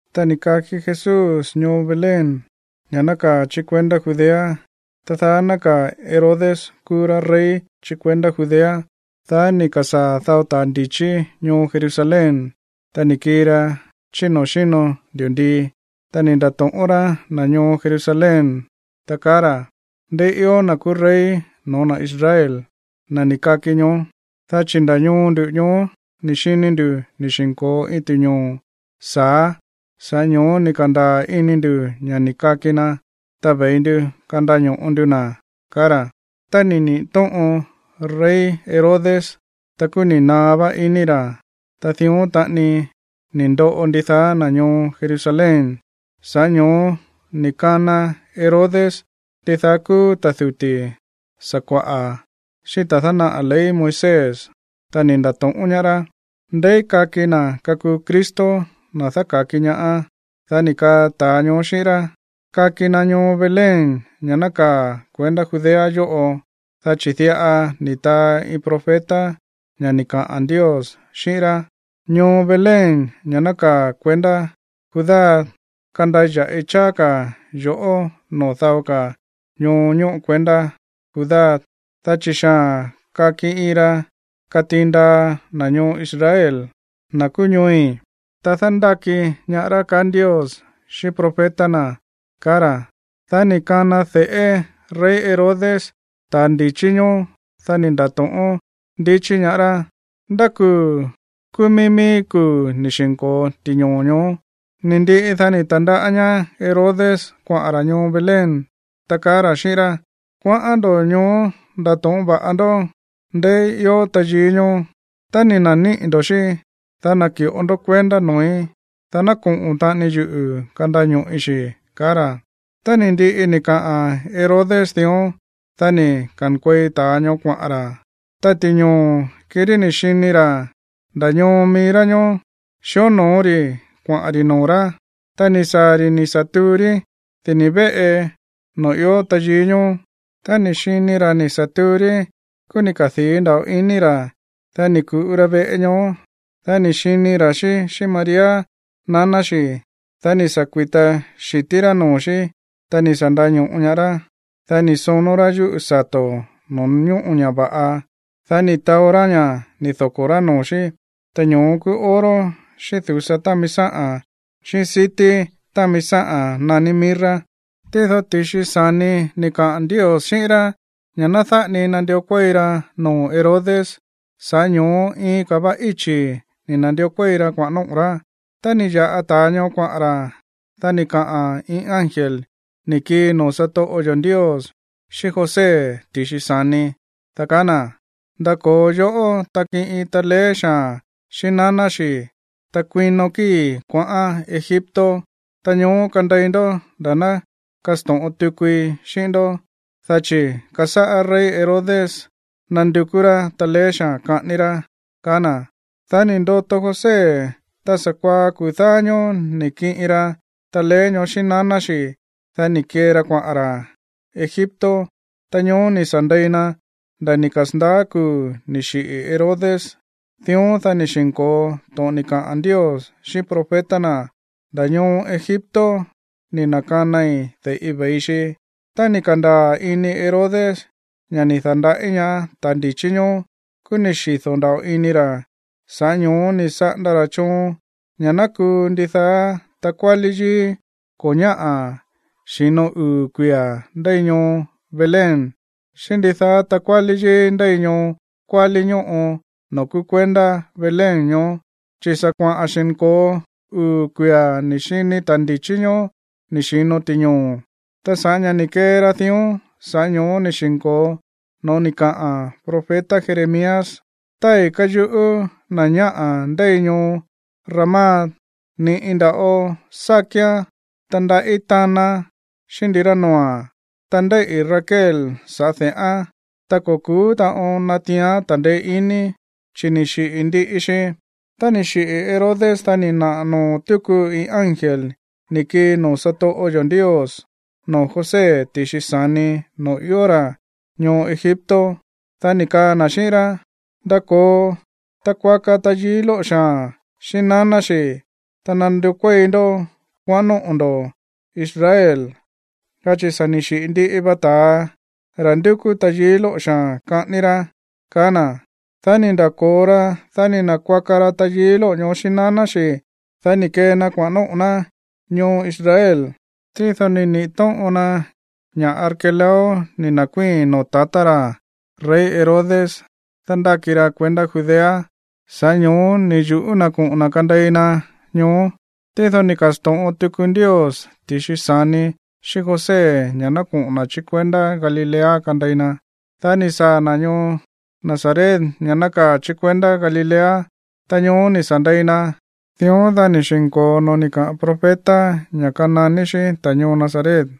Ta ni̱ kaki Jesús ñoo Belén, ña̱ nákaa̱ chí kuendá Judea, ta daá nákaa̱ Herodes kúú rá rey chí kuendá Judea. Dá ni̱ ka̱sáa̱ dao ta̱ ndi̱chí ñoo Jerusalén, ta ni̱ kii ra chí noo̱ xíno ndi̱ndii. Ta ni̱ nda̱to̱ꞌón rá na̱ ñoo Jerusalén, ta kaá ra̱: ―¿Ndeí ió na̱ kúú rey no̱ó na̱ Israel, na̱ ni̱ kaki ñoó? Dá chi̱ nda̱ ñoo ndu̱ ñoó ni̱ xini ndu̱ ni̱ xi̱nko̱o iin ti̱ñoo̱ sa̱á, sa̱ꞌá ño̱ó ni̱ ka̱ndaa̱ ini ndu̱ ña̱ ni̱ kaki na, ta ve̱i ndu kandaño̱ꞌo ndu na̱ ―kaá ra̱. Tá ni̱ niꞌi̱ tóꞌon rey Herodes, ta kúú ni̱ naá vá ini ra̱, ta dión taꞌani ni̱ ndoꞌo ndidaá na̱ ñoo Jerusalén. Sa̱ꞌá ño̱ó ni̱ kana Herodes ndidaá kúú ta̱ duti̱ sakua̱ꞌa̱, xíꞌín ta̱ dánaꞌa̱ ley Moisés, ta ni̱ nda̱to̱ꞌón ñaá rá: ―¿Ndeí kaki na̱ kakuu Cristo, na̱ dáka̱ki ñaá? Dá ni̱ kaa ta̱a ñoó xíꞌín rá: ―Kaki na ñoo Belén, ña̱ nákaa̱ kuendá Judea yóꞌo, dá chi̱ diꞌa ni̱ taa iin profeta ña̱ ni̱ kaꞌa̱n Ndios xíꞌín ná: Ñoo Belén, ña̱ nákaa̱ kuendá Judá, kandaya̱ꞌi cháá ka̱ yo̱ꞌó noo̱ dao ka̱ ñoo ñóꞌo kuendá Judá, dá chi̱ xaa̱n kaki iin ra̱ katiin ndaa na̱ ñoo Israel, na̱ kúú ñooi̱, ta dándáki ñaá rá, kaá Ndios xíꞌín profeta na̱ ―kaá ra̱. Dá ni̱ kana de̱ꞌé rey Herodes ta̱a ndi̱chí ñoó, dá ni̱ nda̱to̱ꞌón ndichí ñaá rá ndá kuu̱ kúú mií mií kuu̱ ni̱ xi̱nko̱o ti̱ñoo̱ ñoó. Ni̱ ndiꞌi, dá ni̱ ta̱ndaꞌá ñaá Herodes kuaꞌa̱n ra̱ ñoo Belén, ta kaá ra̱ xíꞌín rá: ―Kuaꞌán ndo̱ ñoó ndato̱ꞌón va̱ꞌa ndó ndeí ió tayií ñoó. Tá ni̱ na̱níꞌi̱ ndo̱ xí, dá naki̱ꞌo ndó kuendá noo̱í, dá ná koꞌo̱n taꞌani yuꞌu̱ kandaño̱ꞌi xi̱ ―kaá ra̱. Tá ni̱ ndiꞌi ni̱ kaꞌa̱n Herodes dión, dá ni̱ ka̱nkuei ta̱a ñoó kuaꞌa̱n ra̱. Ta ti̱ñoo̱, kirí ni̱ xini ra̱ nda̱ ñoo mií rá ñoó xíonoo rí kuaꞌa̱n ri̱ noo̱ rá. Ta ni̱ saa̱ ri̱ ni̱ sa̱ tuu rí dini̱ véꞌe noo̱ ió tayií ñoó. Tá ni̱ xini ra̱ ni̱ sa̱ tuu rí, kúú ni̱ kadii̱ nda̱ꞌo iní ra̱. Dá ni̱ ku̱ꞌu ra veꞌe ñoó. Dá ni̱ xini ra̱ xí xíꞌín María, naná xi̱. Dá ni̱ sa̱ kui̱ta xi̱tí rá noo̱ xí, ta ni̱ sa̱ ndaño̱ꞌo ñaá rá. Dá ni̱ sonó rá yúꞌu̱ sato̱ noo̱ ñóꞌo ña̱ va̱ꞌa, dá ni̱ taó rá ña̱ ni̱ doko̱ rá noo̱ xí. Ta ñoó kúú oro, xíꞌín du̱sa támi sáꞌa̱n, xíꞌín sití támi sáꞌa̱n naní mirra. Tído ti̱xi sa̱ni ni̱ kaꞌa̱n Ndios xíꞌín rá ña̱ ná dáꞌa ni nandió kuéi ra noo̱ Herodes. Sa̱ꞌá ño̱ó iin ka̱ va íchi̱ ni̱ na̱ndió kuéi ra kuaꞌa̱n nóꞌo̱ rá. Tá ni̱ ya̱ꞌa ta̱a ñoó kuaꞌa̱n ra̱, dá ni̱ kaꞌa̱n iin ángel ni̱ kii noo̱ satoꞌo yo̱ Ndios xíꞌín José ti̱xi sa̱ni, dá kaá na̱: ―Ndako̱o yoꞌó, ta kiꞌin taleé xaa̱n xíꞌín naná xi̱, ta kuino kíi̱ kuaꞌán Egipto, ta ñoó kandei ndó nda̱ ná kasto̱ꞌon tukui xíꞌín ndó, dá chi̱ kasáꞌá rey Herodes nándukú rá taleé xaa̱n kaꞌání rá ―kaá na̱. Dá ni̱ ndoto José, ta sa̱kuaá kuu̱ dáá ñóó ni̱ kiꞌin ra taleé ñoó xíꞌín naná xi̱, dá ni̱ kee ra kuaꞌa̱n ra̱ Egipto. Ta ñoó ni̱ sa̱ ndei na nda̱ ni̱ kasa̱ndaá kuu̱ ni̱ xiꞌi̱ Herodes. Dión, dá ni̱ xi̱nko̱o to̱ꞌon ni̱ kaꞌa̱n Ndios xíꞌín profeta na̱: “Nda̱ ñoo Egipto ni̱ na̱kanai de̱ꞌi ve̱i xi.” Tá ni̱ ka̱ndaa̱ iní Herodes ña̱ ni̱ da̱nda̱ꞌí ñaá ta̱ ndi̱chí ñoó, kúú ni̱ xido̱ nda̱ꞌo ini ra̱. Sa̱ꞌá ño̱ó ni̱ saꞌanda ra̱ choon ña̱ ná kuu ndidaá takuálí yíí ko̱ ñáꞌa̱ xi̱no uu̱ kuia̱ ndéi ñoo Belén xíꞌín ndidaá takuálí yíí ndéi ñoo kuálí ñóꞌo noo̱ kúú kuendá Belén ñoó, chi̱ sa̱ kuaꞌa̱n xi̱nko̱o uu̱ kuia̱ ni̱ xini ta̱ ndi̱chí ñoó ni̱ xi̱no ti̱ñoo̱. Ta sa̱ꞌá ña̱ ni̱ kee ra dión, sa̱ꞌá ño̱ó ni̱ xi̱nko̱o no̱ó ni̱ kaꞌa̱n profeta Jeremías: Tái̱ káyuꞌú na̱ ñáꞌa̱ ndéi ñoo Ramá. Ni̱ꞌi nda̱ꞌo sá kíán, ta ndaꞌí tánaán xíꞌín ndirá noo̱a̱n. Ta ndéíꞌi̱ Raquel saꞌa̱ de̱ꞌán, ta ko̱ ku̱ú taꞌon natiián ta̱ndeé iní, chi̱ ni̱ xiꞌi̱ ndiꞌi xi. Tá ni̱ xiꞌi̱ Herodes, dá ni̱ naꞌa̱ noo̱ túku iin ángel ni̱ kii noo̱ satoꞌo yo̱ Ndios noo̱ José ti̱xi sa̱ni noo̱ ió ra̱ ñoo Egipto, dá ni̱ kaa na̱ xíꞌín rá: ―Ndako̱o, ta kuaka tayií lóꞌo̱ xaa̱n xíꞌín naná xi̱, ta nandió kuéi ndó kuaꞌán nóꞌo̱ ndo̱ Israel, dá chi̱ sa̱ ni̱ xiꞌi̱ ndiꞌi va ta̱a, ra̱ ndúkú tayií lóꞌo̱ xaa̱n kaꞌání rá ―kaá na̱. Dá ni̱ nda̱ko̱o ra, dá ni̱ na̱kuaka ra tayií lóꞌo̱ ñoó xíꞌín naná xi̱, dá ni̱ kee na kuaꞌa̱n nóꞌo̱ ná ñoo Israel. Tído ni̱ niꞌi̱ tóꞌon na ña̱ Arquelao ni̱ na̱kuíi̱n noo̱ tatá ra̱ rey Herodes dándáki ra kuendá Judea, sa̱ꞌá ño̱ó ni̱ yu̱ꞌú na̱ koꞌo̱n na̱ kandei na ñoó. Tído ni̱ ka̱sto̱ꞌon tuku Ndios ti̱xi sa̱ni xíꞌín José ña̱ ná koꞌo̱n na̱ chí kuendá Galilea kandei na. Dá ni̱ saa̱ na̱ ñoo Nazaret, ña̱ nákaa̱ chí kuendá Galilea, ta ñoó ni̱ sa̱ ndei na. Dión, dá ni̱ xi̱nko̱o no̱ó ni̱ kaꞌa̱n profeta ña̱ kananí xí ta̱ ñoo Nazaret.